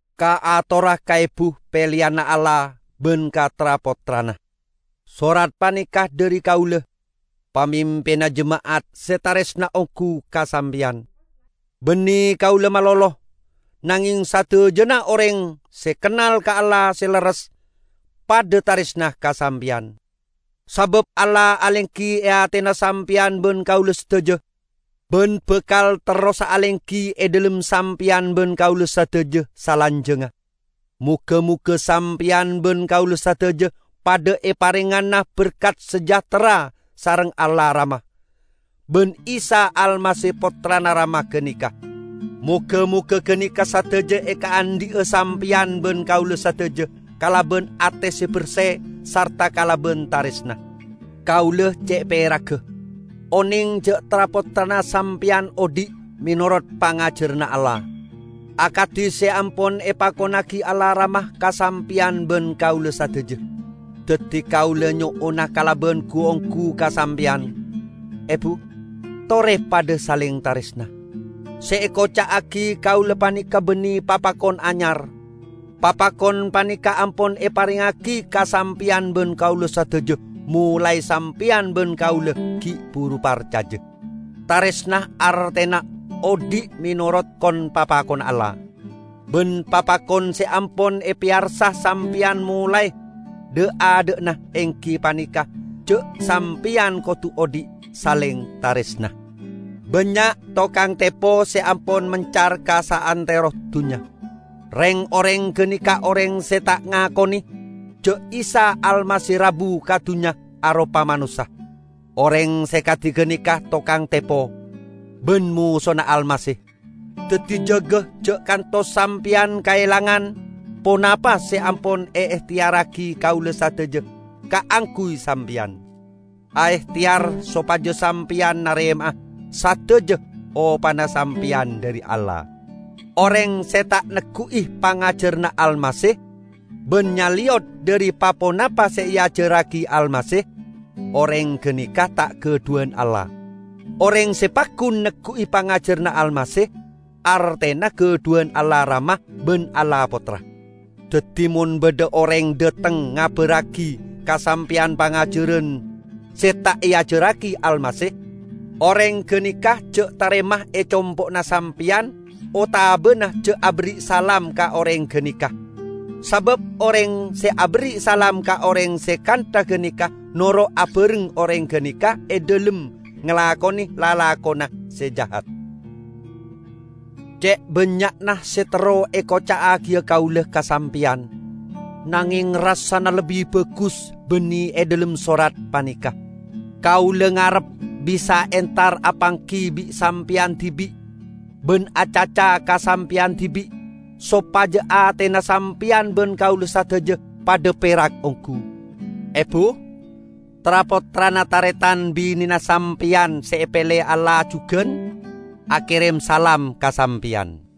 Kaatora ka Ebu peleyanna Allah ban ka tra-pottrana. Sorat paneka dhari kaula, pamimpinna jema'at se taresna onggu ka sampeyan. Banne kaula malolo, nangeng sadajana oreng se kennal ka Allah se lerres, padha taresna ka sampeyan. Sabab Allah alenggi e atena sampeyan ban kaula sadaja, ban bakal terrosa alenggi e dhalem sampeyan ban kaula sadaja salanjangnga. Moga-moga sampeyan ban kaula sadaja padha eparengngana berkat sejahtera sareng Allah Rama, ban Isa Almasih Pottrana Rama ganeka. Moga-moga ganeka sadaja ekaandhi'a sampeyan ban kaula sadaja kalaban ate se berse sarta kalaban taresna. Kaula ce' peragga oneng ja' tra-pottrana sampeyan odhi' menorot pangajaranna Allah, akadi se ampon epakonnagi Allah Rama ka sampeyan ban kaula sadaja. Daddi kaula nyo'ona kalaban gu-onggu ka sampeyan, Ebu, tore padha saleng taresna. Se ekoca'agi kaula paneka banne papakon anyar; papakon paneka ampon eparengngagi ka sampeyan ban kaula sadaja molae sampeyan ban kaula gi' buru parcaja. Taresna artena odhi' menorot kon-papakonna Allah. Ban papakon se ampon epeyarsa sampeyan molae dha'-adha'na enggi paneka ja' sampeyan kodu odhi' saleng taresna. Bannya' tokang tepo se ampon mencar ka saantero dunnya. Reng-oreng ganeka oreng se ta' ngakone ja' Isa Almasih rabu ka dunnya aropa manossa. Oreng se kadi ganeka tokang tepo, ban Mosona Almasih. Daddi jaga ja' kantos sampeyan kaelangan ponapa se ampon eehteyarragi kaula sadaja kaangguy sampeyan. Aehteyar sopaja sampeyan narema sadaja opana sampeyan dhari Allah. Oreng se ta' neggu'i pangajaranna Almasih, ban nyaleyot dhari pa-ponapa se eajarragi Almasih, oreng ganeka ta' gadhuwan Allah. Oreng se paggun neggu'i pangajaranna Almasih, artena gadhuwan Allah Rama ban Allah Pottra. Daddi mon badha oreng dhateng ngabarragi ka sampeyan pangajaran se ta' eajarragi Almasih, oreng ganeka ja' tarema e compo'na sampeyan otabana ja' aberri' salam ka oreng ganeka. Sabab oreng se aberri' salam ka oreng se kantha ganeka noro' abareng oreng ganeka e dhalem ngalakone lalakonna se jahat. Ce' bannya'na se terro ekoca'agiya kaula ka sampeyan, nangeng rassana lebbi bagus banne e dhalem sorat paneka. Kaula ngarep bisa entar apanggi bi' sampeyan dibi' ban acaca ka sampeyan dibi' sopaja atena sampeyan ban kaula sadaja padha perak onggu. Ebu, tra-pottrana taretan bine'na sampeyan se epele Allah jugan, akerem salam ka sampeyan.